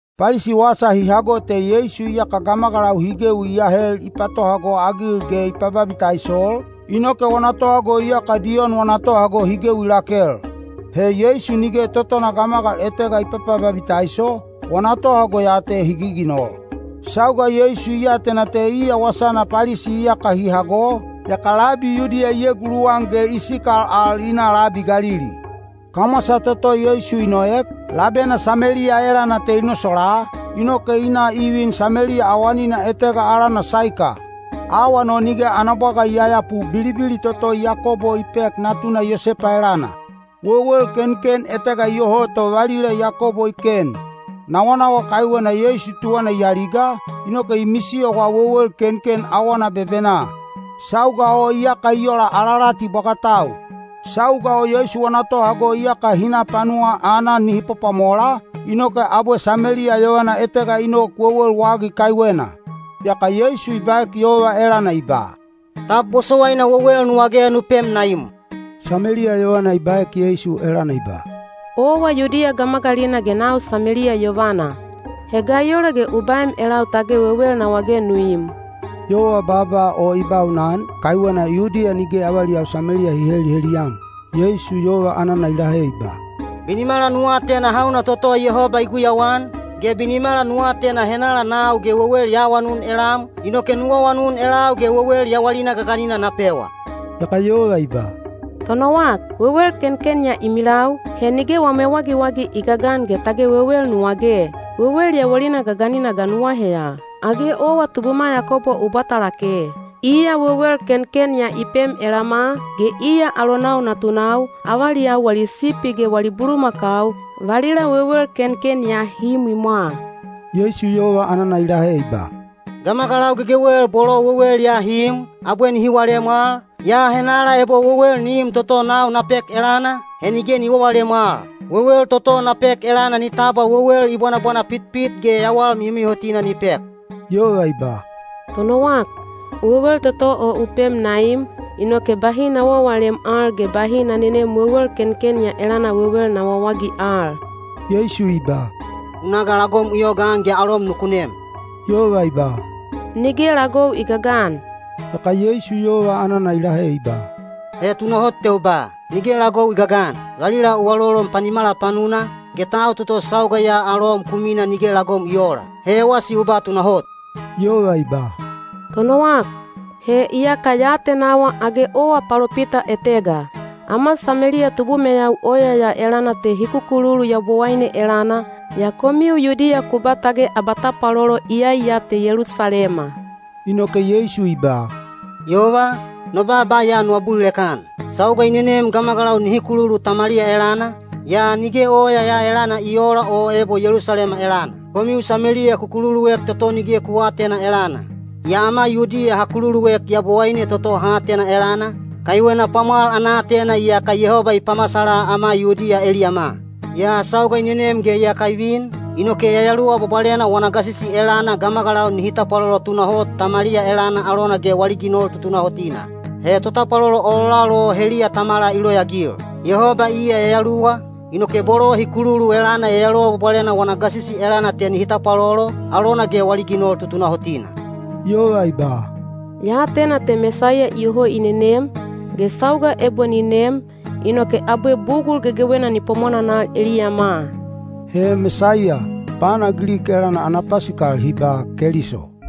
Palisi wasa hi hago te Yeisu iyaka gamagalau hi gewi i ahel i patohago-agil ge i pababitaisol, inoke wana tohago iyaka Diyon wana tohago hi gewi lakel. He Yeisu nige totona gamagal etega i papababitaiso, wana tohago ya te hi giginol. Sauga Yeisu i atena te iya wasana Palisi iyaka hi hago, yaka labi Yudiya i eguluwan ge i sikal al i na labi Galili. Kamwasa toto Yeisu i noek, labena Sameliya elana te i nosolaa, inoke i na i vin Sameliya awanina etega alana Saika. Awan o nige ana bwaga i yayapu bilibili toto Yakobo i pek natuna Yosepa elana. Wewel kenken etega iyoho to valila Yakobo i ken. Nawanawa kaiwena Yeisu tuwana i aliga, inoke i misiyowa wewel kenken awana bebenaa. Sauga o iyaka i ola alalati bwagatau. Sauga o Yeisu wana tohago iyaka hi na panuwaa aanan nihi pwapwamola, inoke abwe Sameliya yovana etega i nok wewel wagi kaiwena. Yaka Yeisu i baek yova elana i ba, “Tab bosowaina wewel nu wage nu pem na im?” Sameliya yovana i baek Yeisu elana i ba, “Owa Yudiya gamagalina ge nau Sameliya yovana. He ga i ola ge u baem elau tage wewel na wage nu im?” Yova baaba o i baunan, kaiwena Yudiya nige avaliyau Sameliya hi heliheliyam. Yeisu yova anana i lahe i ba, “Binimala nu atena hauna toto Yehoba i guyauan, ge binimala nu atena henala nau ge wewel ya awanun elam, inoke nu awanun elau ge wewel yawalina gaganina na pewa.” Yaka yova i ba, “Tonowak, wewel kenken ya i milau, he nige wam ewagiwagi i gagan ge tage wewel nu wage. Wewel yawalina gaganina ga nu aheya? Age owa tubuma Yakobo u bwata lake? Iya wewel kenken ya i pem elama, ge iya alonau natunau, avaliyau wali sipi ge wali bulumakau, valila wewel kenken ya hi imwimwa.” Yeisu yova anana i lahe i ba, “Gamagalau gegewel bolo wewel ya hi im, abwe nihi walem al, yaa henala ebo wewel ni im toto nau na pek elana, he nige ni wawalem al. Wewel toto na pek elana ni tabwa wewel i bwanabwana pitpit ge yawal mihomihotina ni pek.” Yova i ba, “Tonowak, wewel toto o u pem na im, inoke bahi na wawalem al ge bahi na nenem wewel kenken ya elana wewel na wawagi al.” Yeisu i ba, “U na ga lagom u yogaan ge alom nuku nem.” Yova i ba, “Nige lagou i gagan.” Yaka Yeisu yova anana i lahe i ba, “He tunahot te u ba, ‘Nige lagou i gagan.’ Valila u alolon panimala panuna, ge tau toto sauga ya alom ku mina nige lagom i oola. He ewasi u ba tunahot.” Yova i ba, “Tonowak, he iyaka ya atenawa age owa palopita etega. Ama Sameliya tubumeyau oya ya elana te hi kukululu Yabowaine elana, yaa komiu Yudiya ku ba tage abatapwalolo iyai ya te Yelusalema.” Inoke Yeisu i ba, “Yova, no baaba ya nu abulilek-an. Sauga i nenem gamagalau nihi kululu Tamaliya elana, yaa nige oya ya elana i oola o ebo Yelusalema elana. Komiu Sameliya ku kululuek toto nige ku aatena elana; yaa ama Yudiya ha kululuek Yabowaine toto ha atena elana, kaiwena pwamwal ana aatena iyaka Yehoba i pamasala ama Yudiya eliyama. Yaa sauga i nenem ge iyaka i vin, inoke Yayaluwa Bwabwalena wana gasisi elana gamagalau nihi tapwalolo tunahot Tamaliya elana alona ge wali ginol tutunahotina. He totapwalolo ololal o heliya Tamala i loyaagil. Yehoba iya yayaluwa, inoke bolo hi kululu elana Yayaluwa Bwabwalena wana gasisi elana te nihi tapwalolo, alona ge wali ginol tutunahotina.” Yova i ba, “Ya atena te Mesaiya iyoho i nenem, ge sauga ebo ni nem, inoke abwe bugul gegewena ni pwamwananal eliyama.” (He “Mesaiya” pana Gilik elana hi ba “Keliso.”)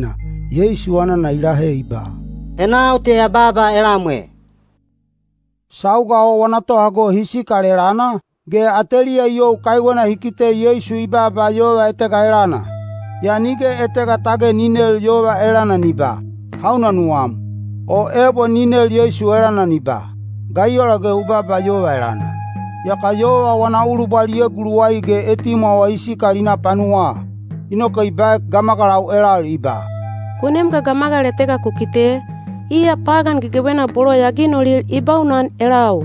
Yeisu anana i lahe i ba, “He nau te ya baaba elam e.” Sauga o wana tohago hi sikal elana, ge ateliya i you kaiwena hi kite Yeisu i baaba yova etega elana. Yaa nige etega tage ni nel yova elana ni ba, “Hauna nuwam?” o ebo ni nel Yeisu elana ni ba, “Ga i ola ge u baaba yova elana?” Yaka yova wana ulubwal i eguluwai ge etimwawa i sikal i na panuwaa. Inoke i baek gamagalau elal i ba, “Ku nem ga gamagal etega ku kite, iya pagan gegewena bolo ya ginolil i baunan elau.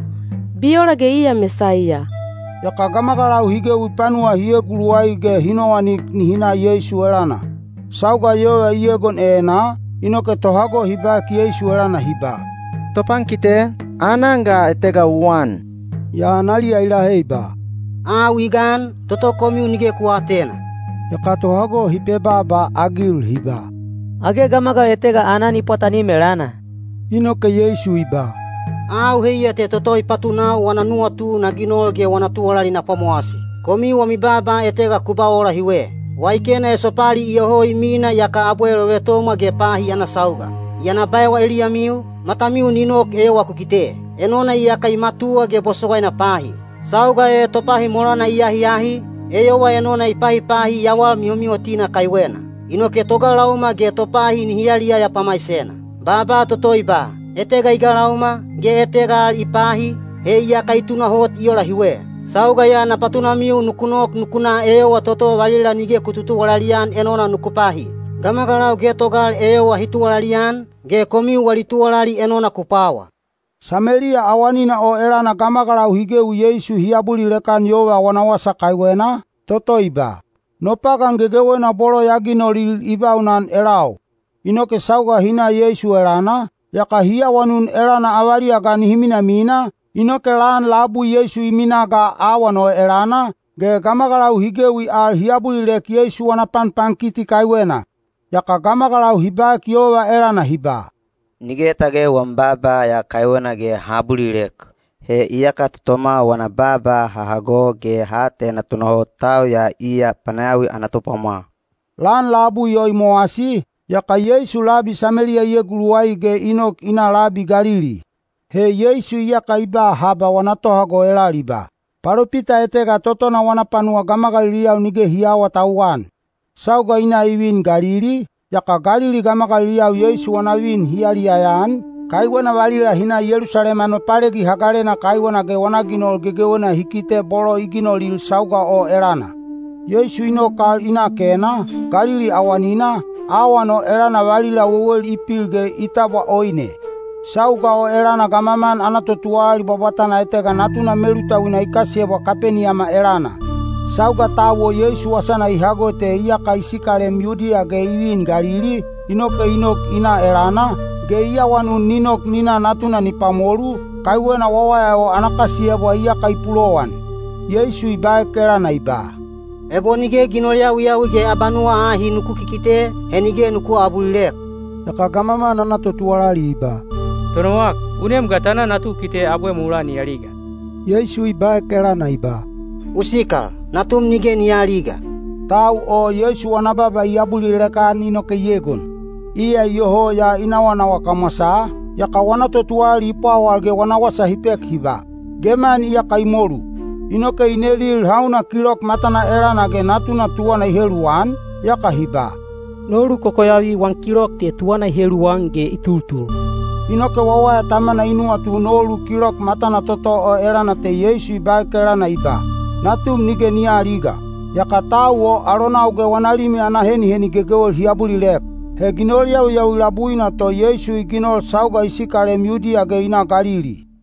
Bi ola ge iya Mesaiya?” Yaka gamagalau hi gewi panuwa hi eguluwai ge hi nowanik nihi na Yeisu elana. Sauga yova i egon enaa, inoke tohago hi baek Yeisu elana hi ba, “Topankite, aanan ga etega u an.” Yaa analiya i lahe i ba, “Au i gan, toto komiu nige ku aatena.” Yaka tohago hi pebaaba-agil hi ba, “Age gamagal etega aanan i pwatanim elana?” Inoke Yeisu i ba, “Au heiya te toto i patunau wana nuwatu na ginol ge wana tuwalali na pwamowasi. Komiu wami baaba etega ku ba ola hiwe: ‘Waikena esopali iyoho i mina yaka abwe lovetomwa ge pahi ana sauga.’ Yaa na baewa eliyamiu, matamiu ni nok eyowa ku kite! Enona iyaka i matuwa ge bosowaina pahi. Sauga e topahi molana i ahiahi, eyowa enona i pahipahi yawal mihomihotina kaiwena. Inoke togalauma ge topahi nihi yaliyaya pamaisena. Baaba toto i ba, ‘Etega i galauma, ge etega al i pahi,’ he iyaka i tunahot i ola hiwe. Sauga ya na patunamiu nuku nok nuku na eyowa toto valila nige ku tutuwalali-an enona nuku pahi. Gamagalau getogal eyowa hi tuwalali-an, ge komiu wali tuwalali enona ku pwawa.” Sameliya awanina o elana gamagalau hi gewi Yeisu hi abulilek-an yova wana wasa kaiwena, toto i ba, “No pagan gegewena bolo ya ginolil i baunan elau.” Inoke sauga hi na Yeisu elana, yaka hi awanun elana avaliya ga nihi minamina, inoke lan labui Yeisu i minaa ga awan o elana, ge gamagalau hi gewi al hi abulilek Yeisu wana panpankiti kaiwena. Yaka gamagalau hi baek yova elana hi ba, “Nige tage wam baaba ya kaiwena ge ha abulilek, he iyaka totoma wana baaba ha hago ge ha atena tunahot tau ya iya panayawi ana Topwamwal.” Lan labui o i mowasi, yaka Yeisu labi Sameliya i eguluwai ge i nok i na labi Galili. (He Yeisu iyaka i ba haba wana tohago elal i ba, “Palopita etega totona wana panuwa gamagaliliyau nige hi aawatauwan.”) Sauga i na i vin Galili, yaka Galili gamagaliliyau Yeisu wana vin hi yaliyaya-an, kaiwena valila hi na Yelusalema Nopalegi Hagalena kaiwena ge wana ginol gegewena hi kite bolo i ginolil sauga o elana. Yeisu i nok al i na Kena, Galili awanina, awan o elana valila wewel i pil ge i tabwa oine. Sauga o elana gamaman ana totuwalali bwabwatana etega natuna melutauina i kasiyebwa Kapeniyama elana. Sauga tau o Yeisu wasana i hago te iyaka i sikalem Yudiya ge i vin Galili, inoke i nok i na elana, ge i awanun ni nok ni na natuna ni pwamolu, kaiwena wawaya o ana kasiyebwa iyaka i pulowan. Yeisu i baek elana i ba, “Ebo nige ginol yawiyawi ge abanuwa ahi nuku kikite, he nige nuku aabulilek.” Yaka gamaman ana totuwalali i ba, “Tonowak, u nem ga ta na natu u kite abwe mulaa ni aliga.” Yeisu i baek elana i ba, “U sikal, natum nige ni aaliga.” Tau o Yeisu wana baaba i abulilek-an inoke i egon. Iya iyoho ya i nawanawa kamwasaa, yaka wana totuwalali i pwawal ge wana wasa hi pek hi ba, “Geman iyaka i molu.” Inoke i nelil hauna kilok matana elana ge natuna tuwana i heluwan, yaka hi ba, “Nolu kokoyavi wan kilok te tuwana i heluwan ge i tultul.” Inoke wawaya tamana i nuwatu nolu kilok matana toto o elana te Yeisu i baek elana i ba, “Natum nige ni aaliga.” Yaka tau o alonau ge wana limi ana heniheni gegewel hi abulilek. He ginol yawiyawi labuina to Yeisu i ginol sauga i sikalem Yudiya ge i na Galili.